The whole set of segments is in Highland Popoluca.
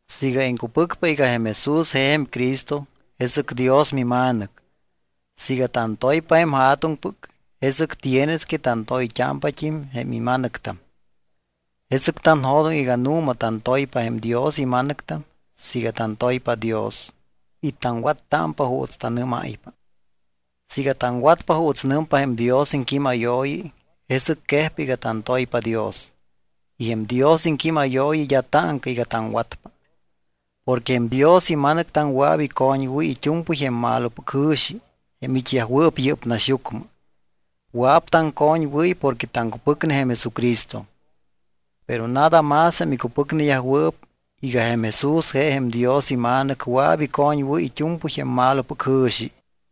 Siiga iŋcupɨcpa iga jém Jesús je jém Cristo, jesɨc Dios mima̱nɨc. Siiga tantoypa jém Ja̱tuŋpɨc, jesɨc tienes que tantoyt́ámpat́im jém ima̱nɨctam. Jesɨc tanjo̱doŋ iga nu̱ma tantoypa jém Dios ima̱nɨctam siiga tantoypa Dios y taŋwattámpa juuts tanɨ́máypa. Siiga taŋwatpa juuts nɨmpa jém Dios iŋquímayooyi, jesɨc quejpa iga tantoypa Dios. Y jém Dios iŋquímayooyi d́a táŋca iga taŋwatpa. Porque jém Dios ima̱nɨctam wɨa̱p icoñwɨ́y it́u̱mpɨy jém malopɨc jɨ̱xi jém it́yajwɨɨp yɨ́p naxyucmɨ. Wɨa̱p taŋcoñwɨ́y porque taŋcupɨcne jém Jesucristo. Pero nada más jém icupɨcneyajwɨɨp iga jém Jesús je jém Dios iMa̱nɨc wɨa̱p icoñwɨ́y it́u̱mpɨy jém malopɨc jɨ̱xi.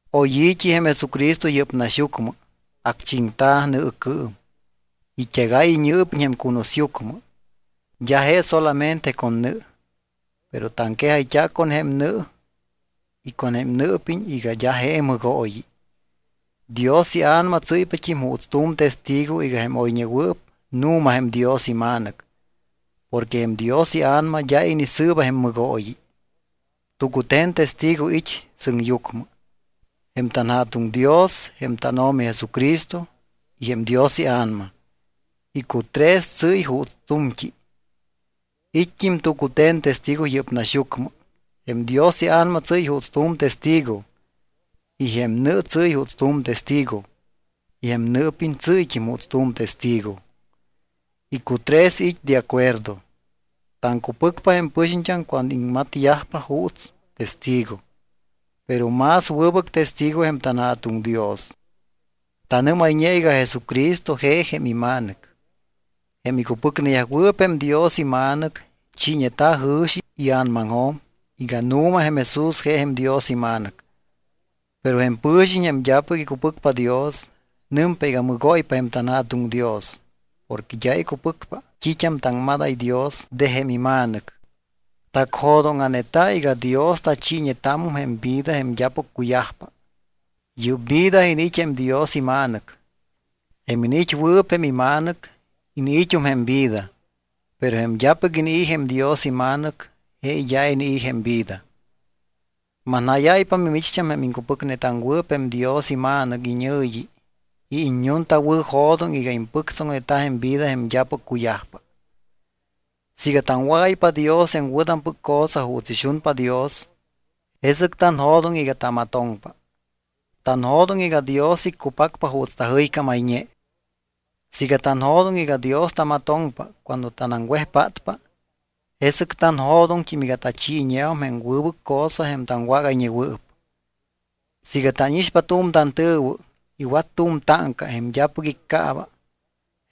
Oy i̱t́i jém Jesucristo yɨ́p naxyucmɨ, acchiŋta̱ nɨɨcɨɨm, it́egáy iñɨɨpiñ jém cunusyucmɨ. D́a je solamente con nɨ, pero taŋquejayt́a̱ con jém nɨ y con jém nɨɨpiñ iga d́a je mɨgooyi. Dios iA̱nama tsɨ́ypat́im juuts tu̱m testigo iga jém oyñewɨɨp nu̱ma jém Dios iMa̱nɨc porque jém Dios iA̱nama d́a inisɨɨba jém mɨgooyi. Tucute̱n testigo it́ sɨŋyucmɨ: jém tanJa̱tuŋ Dios, jém tánO̱mi Jesucristo y jém Dios iA̱nama. Icutres tsɨ́y juuts tu̱mt́i. It́t́im tucute̱n testigo yɨ́p naxyucmɨ: jém Dios iA̱nama tsɨ́y juuts tu̱m testigo, y jém nɨ tsɨ́y juuts tu̱m testigo, y jém nɨɨpiñ tsɨ́yt́im juuts tu̱m testigo. Icutres it́ de acuerdo. Taŋcupɨcpa jém pɨxiñt́am cuando iŋmatyajpa juuts testigo. Pero más wɨbɨc testigo jém tanJa̱tuŋ Dios. Tanɨ́mayñe iga Jesucristo je jém iMa̱nɨc. Jém icupɨcneyajwɨɨp jém Dios iMa̱nɨc chiiñeta̱ jɨ̱xi ia̱namaŋjo̱m iga nu̱ma jém Jesús je jém Dios iMa̱nɨc. Pero jém pɨ̱xiñ, jém d́apɨc icupɨcpa Dios, nɨmpa iga mɨgóypa jém tanJa̱tuŋ Dios porque d́a icupɨcpa t́it́am taŋmadáy Dios de jém iMa̱nɨc. Tacjo̱dóŋa̱neta̱ iga Dios tachiiñetámum jém vida jém d́apɨc cuyajpa, yɨ́p vida iniit́ jém Dios iMa̱nɨc. Jém iniit́wɨɨp jém iMa̱nɨc, iniit́um jém vida. Pero jém d́apɨc inii̱ jém Dios iMa̱nɨc, je d́a inii̱ jém vida. Manjáyáypa mimicht́am jém iŋcupɨcnetaŋwɨɨp jém Dios iMa̱nɨc iñɨ̱yi iga iññuntawɨ̱jo̱doŋ iga impɨctsoŋneta jém vida jém d́apɨc cuyajpa. Siiga taŋwágáypa Dios jém wɨ̱tampɨc cosa juuts ixunpa Dios, jesɨc tanjo̱doŋ iga tamatoŋpa. Tanjo̱doŋ iga Dios iccupacpa juuts tajɨycámayñe. Siiga tanjo̱doŋ iga Dios tamatoŋpa cuando tanaŋwejpátpa, jesɨc tanjo̱doŋt́im iga tachiiñeum jém wɨbɨc cosa jém taŋwágayñewɨɨp. Siiga tánixpa tu̱m tantɨ̱wɨ iwat tu̱m táŋca jém d́apɨc iccaaba,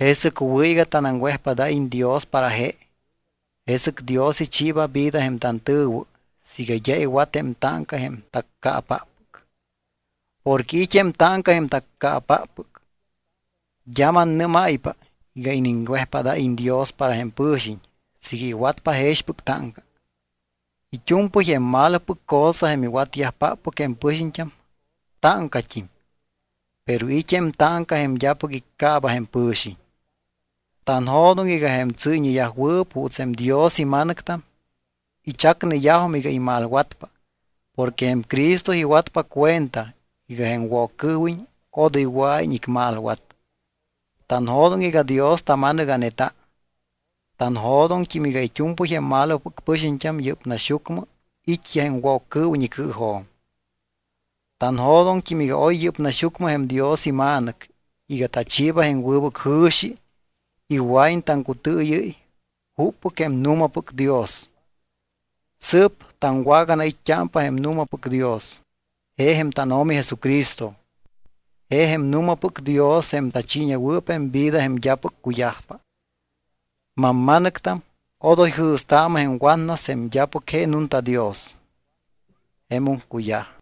jesɨc wɨ̱ iga tanaŋwejpádáyiñ Dios para je. Jesɨc Dios ichiiba vida jém tantɨ̱wɨ siiga d́a iwat jém táŋca jém taccaapáppɨc. Porque it́ jém táŋca jém taccaapáppɨc. D́a mannɨ́máypa iga iniŋwejpádáyiñ Dios para jém pɨ̱xiñ siiga iwatpa jexpɨc táŋca. It́u̱mpɨy jém malopɨc cosa jém iwatyajpáppɨc jém pɨxiñt́am táŋcat́im. Pero it́ jém táŋca jém d́apɨc iccaaba jém pɨ̱xiñ. Tanjo̱doŋ iga jém tsɨ́yñeyajwɨɨp juuts jém Dios ima̱nɨctam ichacneyajum iga imalwatpa porque jém Cristo iwatpa cuenta iga jém Woccɨɨwiñ odoy wɨa̱iñ icmalwat. Tanjo̱doŋ iga Dios tama̱nɨga̱neta. Tanjo̱doŋt́im iga it́u̱mpɨy jém malopɨc pɨxiñt́am yɨ́p naxyucmɨ it́yaj jém Woccɨɨwiñ icɨɨjo̱m. Tanjo̱doŋt́im iga oy yɨ́p naxyucmɨ jém Dios iMa̱nɨc iga tachiiba jém wɨbɨc jɨ̱xi iga wɨa̱iñ taŋcutɨɨyɨ́y juppɨc jém nu̱mapɨc Dios. Sɨɨp taŋwaganait́t́ámpa jém nu̱mapɨc Dios, je jém tánO̱mi Jesucristo. Je jém nu̱mapɨc Dios jém tachiiñewɨɨp jém vida jém d́apɨc cuyajpa. Mamma̱nɨctam, odoy jɨ̱staamɨ jém watnas jém d́apɨc je nunta Dios. Jemum cuyaj.